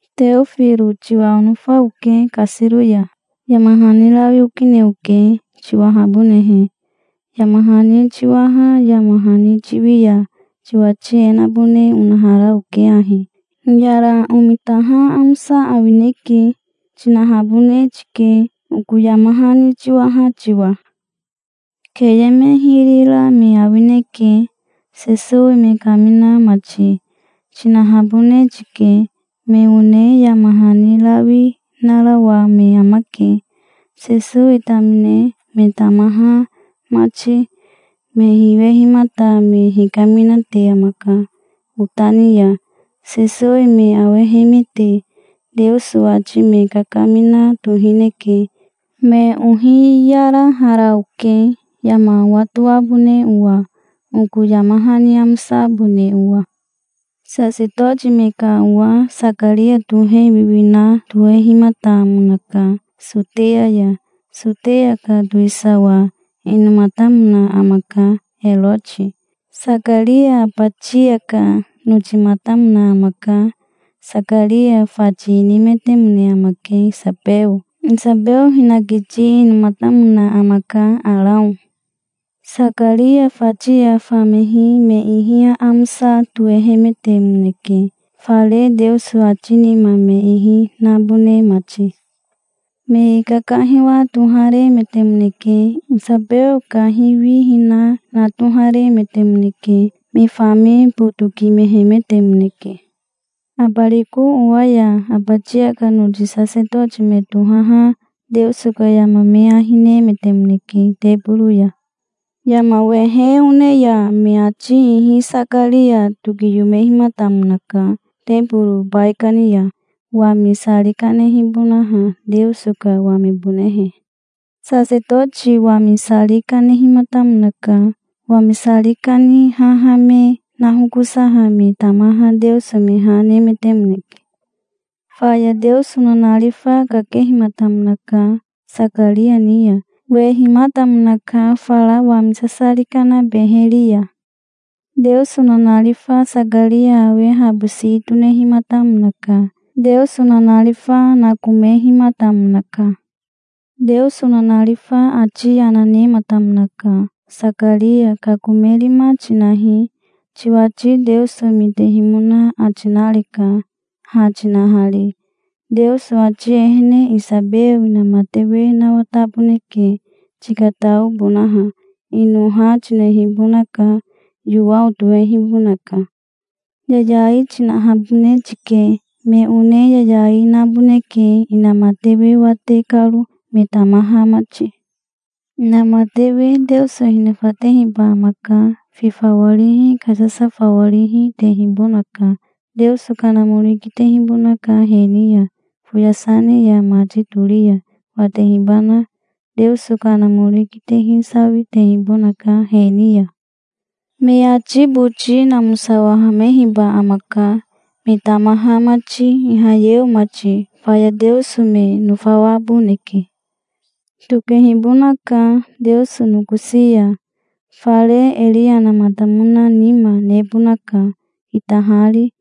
Teofiro tiwa onofa oke, kasiro ya. Yama hani rawi okine oke, tiwahabonehe. Yama hani tiwaha yama hani tiwi ya tiwati e nabone onahara oke ahi: "Hiyara omitaha amosa awineke", tinahabone tike, oko yama hani tiwaha tiwa. "Keye me hiri ra me awineke, Sesowi me kamina mati", tinahabone tike. Me one yama hani rawi narawa me amake, Sesowi tamine, me tamaha mati. Me hiwehimata me hikaminate amaka, ota ni ya. Sesowi me awehemete Teoso ati me kakamina tohineke. Me ohiyarahara oke, yama owatoabone owa, oko yama hani amosabone owa. Sasetoti me ka owa Sakaria tohe wiwina tohehimatamonaka, Soteya ya. Soteya ka towisawa inomatamona amaka Eroti. Sakaria Abatia ka notimatamona amaka. Sakaria fati inimetemone amake Isabeo. Isabeo hinakiti inomatamona amaka Arao. Sakaria fati ya famehi me ihi aamosa tohehemetemoneke, fare Teoso ati nima me ihi nabone mati. Me kakahiwa toharemetemoneke. Isabeo kahiwihina na toharemetemoneke. Me fami botokimehemetemoneke. Abariko owa ya Abatia ka noti sasetoti me tohaha Teoso ka yama me ahi nemetemoneke teboro ya. Yama wehe one ya me ati ihi Sakaria tokiyomehimatamonaka teboro baikani ya, wami sari kanehibonaha, Teoso ka wamibonehe. Sasetoti wami sari kanehimatamonaka. Wami sari kane haha me nahokosa me tamaha Teoso me ha nemetemoneke. Faya Teoso nanarifa kakehimatamonaka Sakaria ni ya. Wehimatamonaka, fara wami sasari kana beheri ya. Teoso nanarifa Sakaria awe habo si tonehimatamonaka. Teoso nanarifa nakomehimatamonaka. Teoso nanarifa ati yana nematamonaka. "Sakaria kakomerima tinahi. Tiwati Teoso mitehimona ati nareka, ha tinahari. Teoso ati ehene Isabeo inamatewe nawataboneke, tikataobonaha. Ino ha tinehibonaka, Yowao tohehibonaka. Yayai tinahabone tike. Me one yayai, naboneke, inamatewe wate karo, me tamaha mati. Inamatewe Teoso hinofatehiba amaka. Fi fawarihi, kasasa fawarihi, tehibonaka. Teoso Kanamori kitehibonaka he ni ya, foyasa ne ya mati tori ya, watehibanoho. Teoso Kanamori kitehi sawitehibonaka he ni ya. Me ati boti namosawahamehiba amaka, me tamaha mati, Ihayeo mati. Faya Teoso me nofawaboneke. Tokehibonaka, Teoso nokosi ya. Fare Eriyamatamona nima nebonaka, kitahari,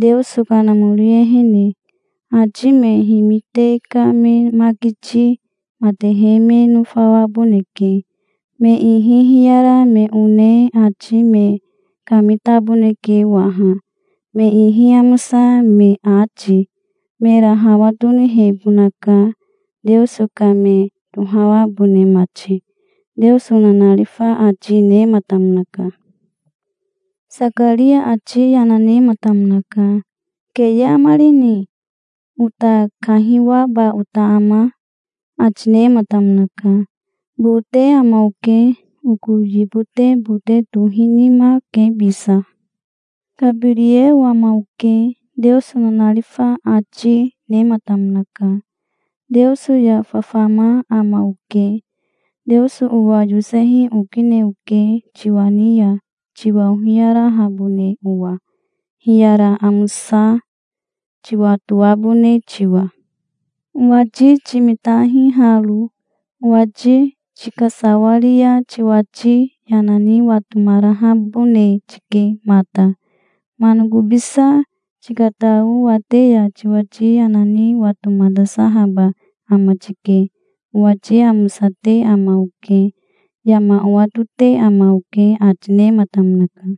Teoso Kanamori ehene. Ati me himite ka me makiti matehe me nofawaboneke. Me ihi hiyara me one ati me kamitaboneke waha, me ihi amosa me ati. Mera hawa tonihebonaka, Teoso ka me tohawabone mati", Teoso nanarifa ati nematamonaka. Sakaria ati yana nematamonaka. "Keye amarini? Ota kahiwaba ota ama?" ati nematamonaka. "Bote ama oke. Oko yibote bote tohinima ke bisa". "Kabirieo ama oke", Teoso nanarifa ati nematamonaka. "Teoso ya fafama ama oke. Teoso owa yosehi okine oke, tiwa ni ya, tiwa ohiyarahabone owa, hiyara amosa tiwatoabone tiwa. Owati timitahi haro. Owati tikasawaria tiwati yana ni watomarahabone tike mata. Manakobisa tikatao wate ya tiwati yana ni watomatasahaba ama tike. Owati amosate ama oke. Yama owatote ama oke", ati nematamonaka.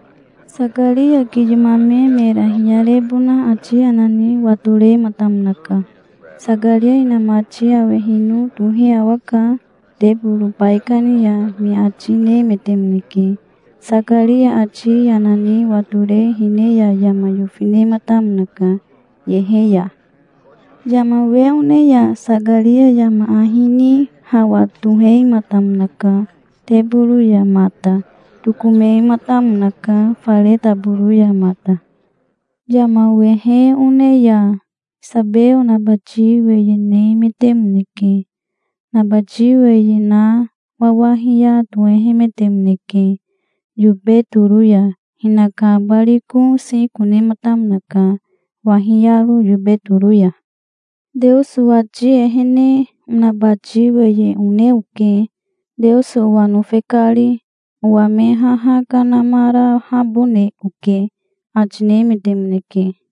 Sakaria kiyomame mera hiyarebona ati yana ni watorematamonaka. "Sakaria inamati awehino tohe awaka, teboro baikani ya", me ati nemetemoneke. Sakaria ati yana ni watore hine ya yama yofi nematamonaka, yehe ya. Yama wehe one ya Sakaria yama ahi ni hawa tohematamonaka, teboro ya mata. Tokomematamonaka, fare taboro ya mata. Yama wehe one ya Isabeo nabati weye nemetemoneke. Nabati weye na wawahiya tohehemetemoneke, yobe toro ya. Hinaka abariko siko nematamonaka, wahiyaro, yobe toro ya. "Teoso ati ehene onabati weye one oke, Teoso owa nofe kari. Owa me haha kanamarahabone oke", ati nemetemoneke.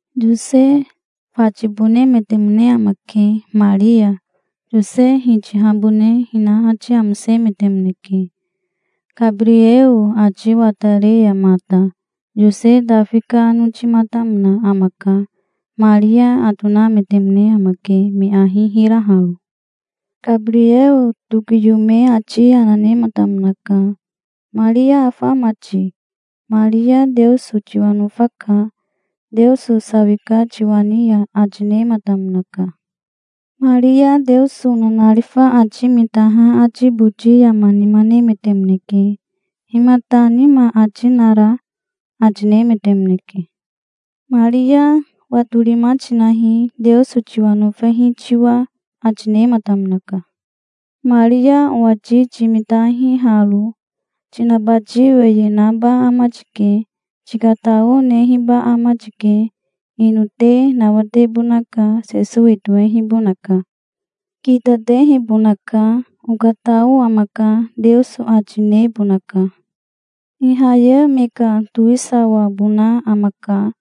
Yose fatibonemetemone amake, Maria. Yose hitihabone hina ati amosemetemoneke, Kabirieo ati watare ya mata. Yose Tafi ka notimatamona amaka. Maria atonametemone amake, me ahi hiraharo. Kabirieo tokiyome ati yana nematamonaka. "Maria afa ama ti? Maria Teoso tiwa nofaka. Teoso sawika tiwa ni ya", ati nematamonaka. Maria Teoso nanarifa ati mitaha ati boti yama nima nemetemoneke. "Himata nima ati nara?" ati nemetemoneke. "Maria watorima tinahi, Teoso tiwa nofehi tiwa", ati nematamonaka. "Maria owati timitahi haro. Tinabati weye naba ama tike. Tikatao nehiba ama tike. Ino te nawatebonaka, Sesowi tohehibonaka. Kitatehibonaka. 'Okatao amaka', Teoso ati nebonaka. Ihayeo me ka towisawabona amaka,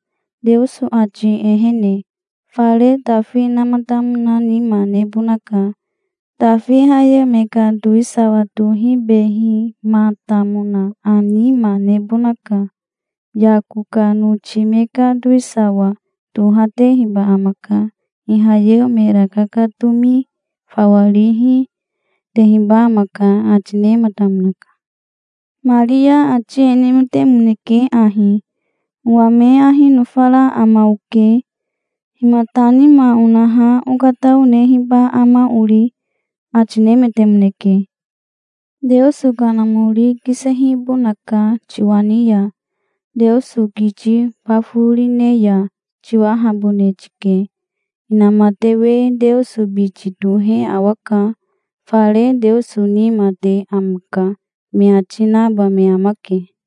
Teoso ati ehene. Fare Tafi namatamona nima nebonaka. Tafi Ihayeo me ka towisawa tohibehimatamona nima nebonaka. Yako ka noti me ka towisawa tohatehiba amaka. Ihayeo mera kakatomi fawa rihi tehiba amaka", ati nematamonaka. Maria ati e nemetemoneke ahi: "Owa me ahi nofara ama oke. Himata nima onaha okatao nehiba ama ori?" ati nemetemoneke. "Teoso Kanamori kisehibonaka tiwa ni ya. Teoso kiti baforine ya tiwahabone tike. 'Inamatewe Teoso biti tohe awaka. Fare Teoso nima te amaka', me ati naba me amake.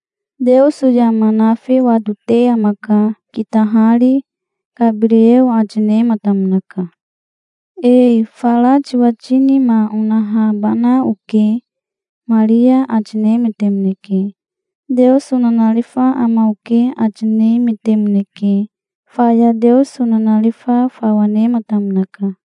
Teoso yama nafi watote amaka, kitahari", Kabirieo ati nematamonaka. "Ee fara tiwati nima onahabana oke", Maria ati nemetemoneke. "Teoso nanarifa ama oke", ati nemetemoneke. Faya Teoso nanarifa fawa nematamonaka.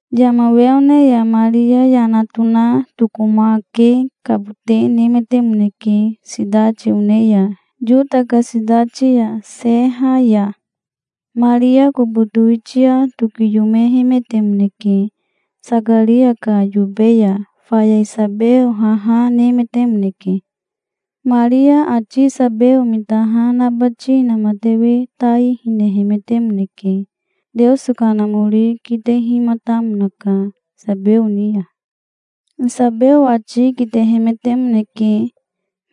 Yama wehe one ya Maria yana tona tokomakekabote nemetemoneke, sitati one ya, Yota ka sitati ya, seha ya. Maria kobo towitia tokiyomehemetemoneke, Sakaria ka yobe ya. Faya Isabeo haha nemetemoneke. Maria ati Isabeo mitaha nabati inamatewe tai hinehemetemoneke. Teoso Kanamori kitehimatamonaka, Isabeo ni ya. Isabeo ati kitehemetemoneke.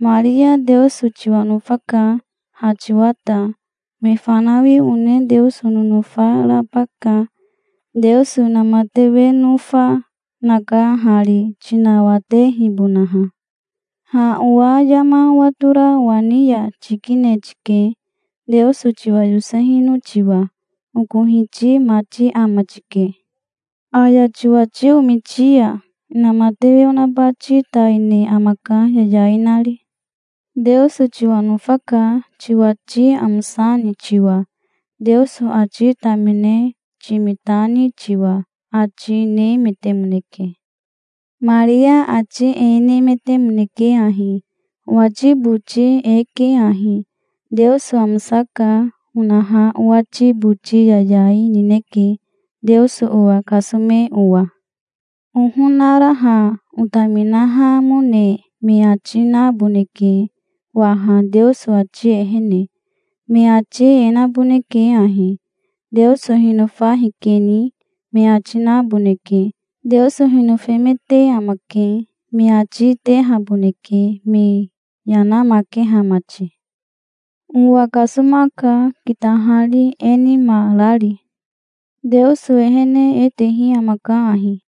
"Maria Teoso tiwa nofaka, ha tiwa ta. Me fanawi one Teoso nonofa raba ka. Teoso inamatewe nofa, naka hari, tinawatehibonaha. Ha owa yama owatora owa ni ya tikine tike, Teoso tiwa yosehino tiwa. Oko Hiti mati ama tike. Aya tiwati omiti ya inamatewe onabati tai ne amaka, yayai nari. Teoso tiwa nofaka, tiwati amosani tiwa, Teoso ati tamine timitani tiwa", ati nemetemoneke. Maria ati e nemetemoneke ahi: "Owati boti e ke ahi: 'Teoso amosaka', onaha owati boti yayai nineke, Teoso owa kasome owa. Ohonaraha otaminahamone me ati naboneke waha Teoso ati ehene. Me ati e naboneke ahi: 'Teoso hinofa hikeni', me ati naboneke. 'Teoso hinofemete amake', me ati tehaboneke, me yanamakeha mati. Owa kasomaka, kitahari, e nima rari. Teoso ehene e tehi amaka ahi: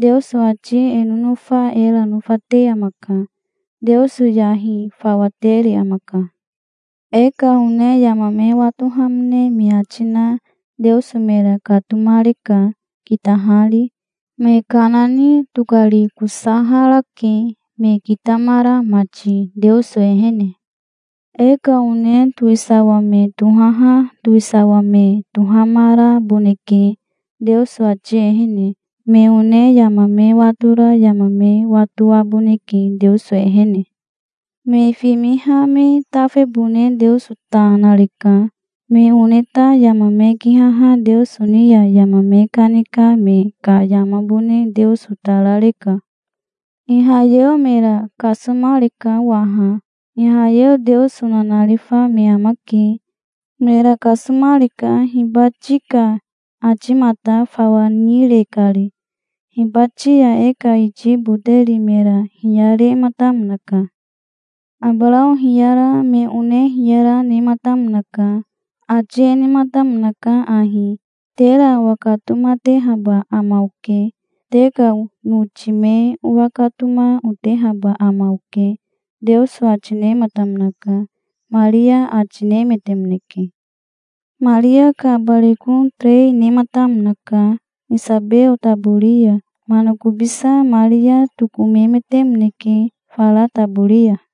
Teoso ati e nonofa era nofate amaka. Teoso yahi fawa tere amaka. E ka one yama me watohamone me ati na Teoso mera katomareka, kitahari. Me kana ni tokarikosaharake, me kitamara mati, Teoso ehene. E ka one towisawa me tohaha towisawa me tohamaraboneke, Teoso ati ehene. Me one yama me watora yama me watoaboneke, Teoso ehene. Me fimiha me tafebone Teoso ta nareka. Me one ta yama me kihaha Teoso ni ya yama me kanika me ka yamabone Teoso ta rareka. Ihayeo mera kasomareka waha. Ihayeo Teoso nanarifa me amake. Mera kasomareka, hibati ka atimata fawa nire kari. Hibati ya e ka iti boteri mera hiyarematamonaka. Abarao hiyara, me one hiyara, nematamonaka. Ati e nematamonaka ahi: 'Tera owakatomatehaba ama oke. Te ka noti me owakatoma, otehaba ama oke', Teoso ati nematamonaka", Maria ati nemetemoneke. Maria ka abariko terei nematamonaka, Isabeo tabori ya. Manakobisa Maria tokomemetemoneke, fara tabori ya.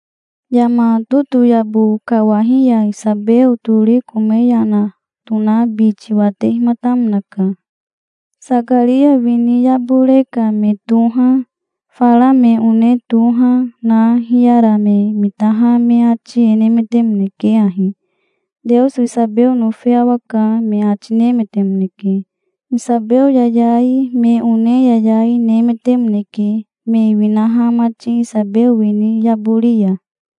Yama totoyabo kawahi ya Isabeo tori kome yana tona biti watehimatamonaka. Sakaria wini yabore ka me toha, fara me one toha na, hiyara me mitaha me ati e nemetemoneke ahi: "Teoso Isabeo nofe awaka", me ati nemetemoneke. Isabeo yayai, me one yayai, nemetemoneke, me winaha mati, Isabeo wini yabori ya.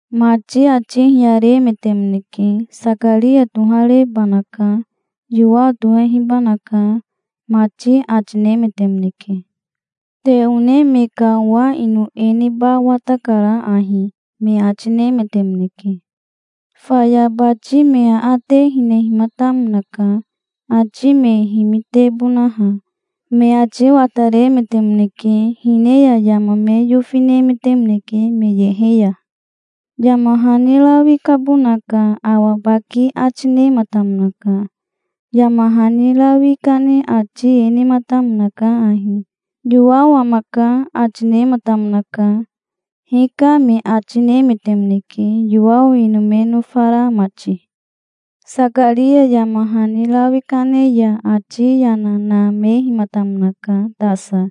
Mati ati hiyaremetemoneke. "Sakaria toharebanaka. Yowao tohehibanaka", mati ati nemetemoneke. "Te one me ka owa ino e neba watakara ahi", me ati nemetemoneke. Faya bati me aate hinehimatamonaka, ati me himitebonaha. Me ati wataremetemoneke, hine ya yama me yofi nemetemoneke, me yehe ya. Yama hani rawi kabona ka awa baki ati nematamonaka. Yama hani rawi kane ati e nematamonaka ahi: "Yowao amaka", ati nematamonaka. "Hika", me ati nemetemoneke, Yowao ino me nofara mati. Sakaria yama hani rawi kane ya ati yana namehimatamonaka tasa,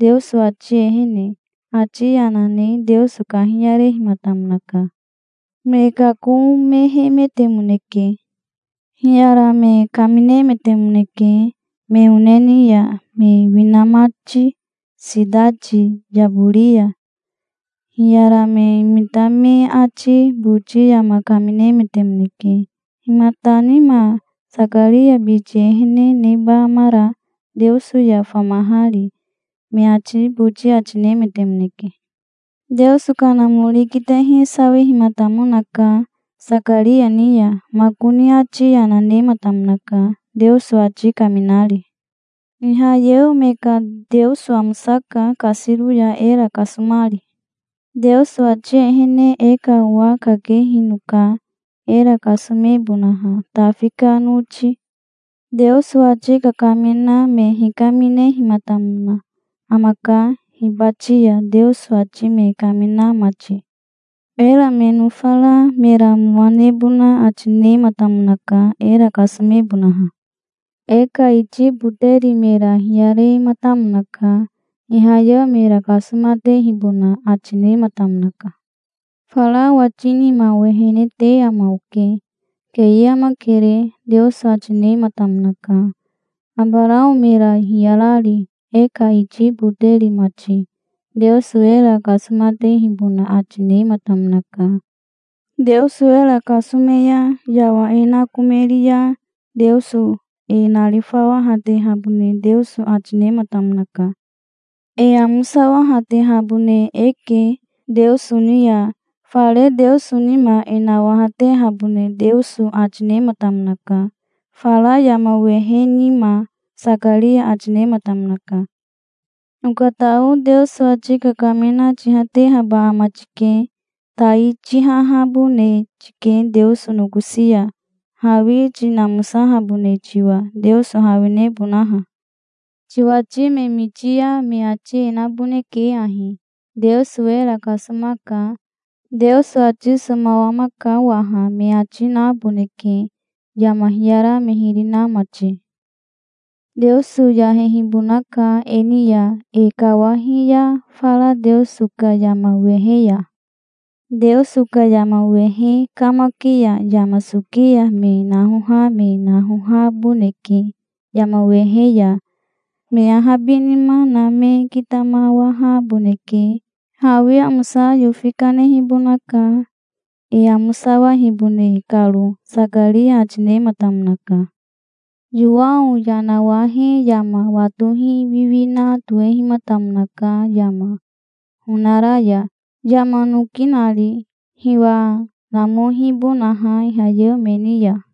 Teoso ati ehene. Ati yana ne Teoso kahiyarehimatamonaka. Me kakomehemetemoneke. Hiyara me kaminemetemoneke me one ni ya, me wina mati, sitati yabori ya. Hiyara me mita me ati boti yama kaminemetemoneke. "Himata nima Sakaria biti ehene neba amara, Teoso ya famahari?" me ati boti ati nemetemoneke. Teoso Kanamori kitehi sawihimatamonaka, Sakaria ni ya. Makoni ati yana nematamonaka, Teoso ati kaminari. "Ihayeo me ka Teoso amosaka kasiro ya, era kasomari. Teoso ati ehene e ka owa kakehinoka, era kasomebonaha, Tafi ka noti. Teoso ati kakamina me hikaminehimatamona amaka hibati ya, Teoso ati me kamina mati. Era me nofara mera mowa nebona ati nematamonaka, era kasomebonaha. E ka iti boteri mera hiyarematamonaka. Ihayeo mera kasomatehibona ati nematamonaka. "Fara owati nima owehene te ama oke. Keye amakere", Teoso ati nematamonaka, Abarao mera hiyarari, e ka iti boteri mati. Teoso era kasomatehibona ati nematamonaka. Teoso era kasome ya yawa e nakomeri ya Teoso e narifawahatehabone Teoso ati nematamonaka. E amosawahatehabone eke, Teoso ni ya. Fare Teoso nima e nawahatehabone Teoso ati nematamonaka, fara yama wehe nima", Sakaria ati nematamonaka. "Okatao Teoso ati kakamina tihatehaba ama tike. Tai tihahabone tike Teoso nokosi ya, hawi tinamosahabone tiwa, Teoso hawinebonaha. Tiwati me miti ya me ati e naboneke ahi: 'Teoso era kasomaka. Teoso ati somawamaka waha', me ati naboneke, yama hiyara me hiri na mati. Teoso yahehibonaka, e ni ya, e kawahi ya, fara Teoso ka yama wehe ya. Teoso ka yama wehe kamaki ya yama soki ya me nahoha me nahohaboneke yama wehe ya. Me ahabinima na me kitamawahaboneke. Hawi amosa yofi kanehibonaka, e amosawahibone karo", Sakaria ati nematamonaka. Yowao yanawahe yama watohi wiwina tohehimatamonaka yama honara ya, yama noki nari, hiwa namohibonaha Ihayeo me ni ya.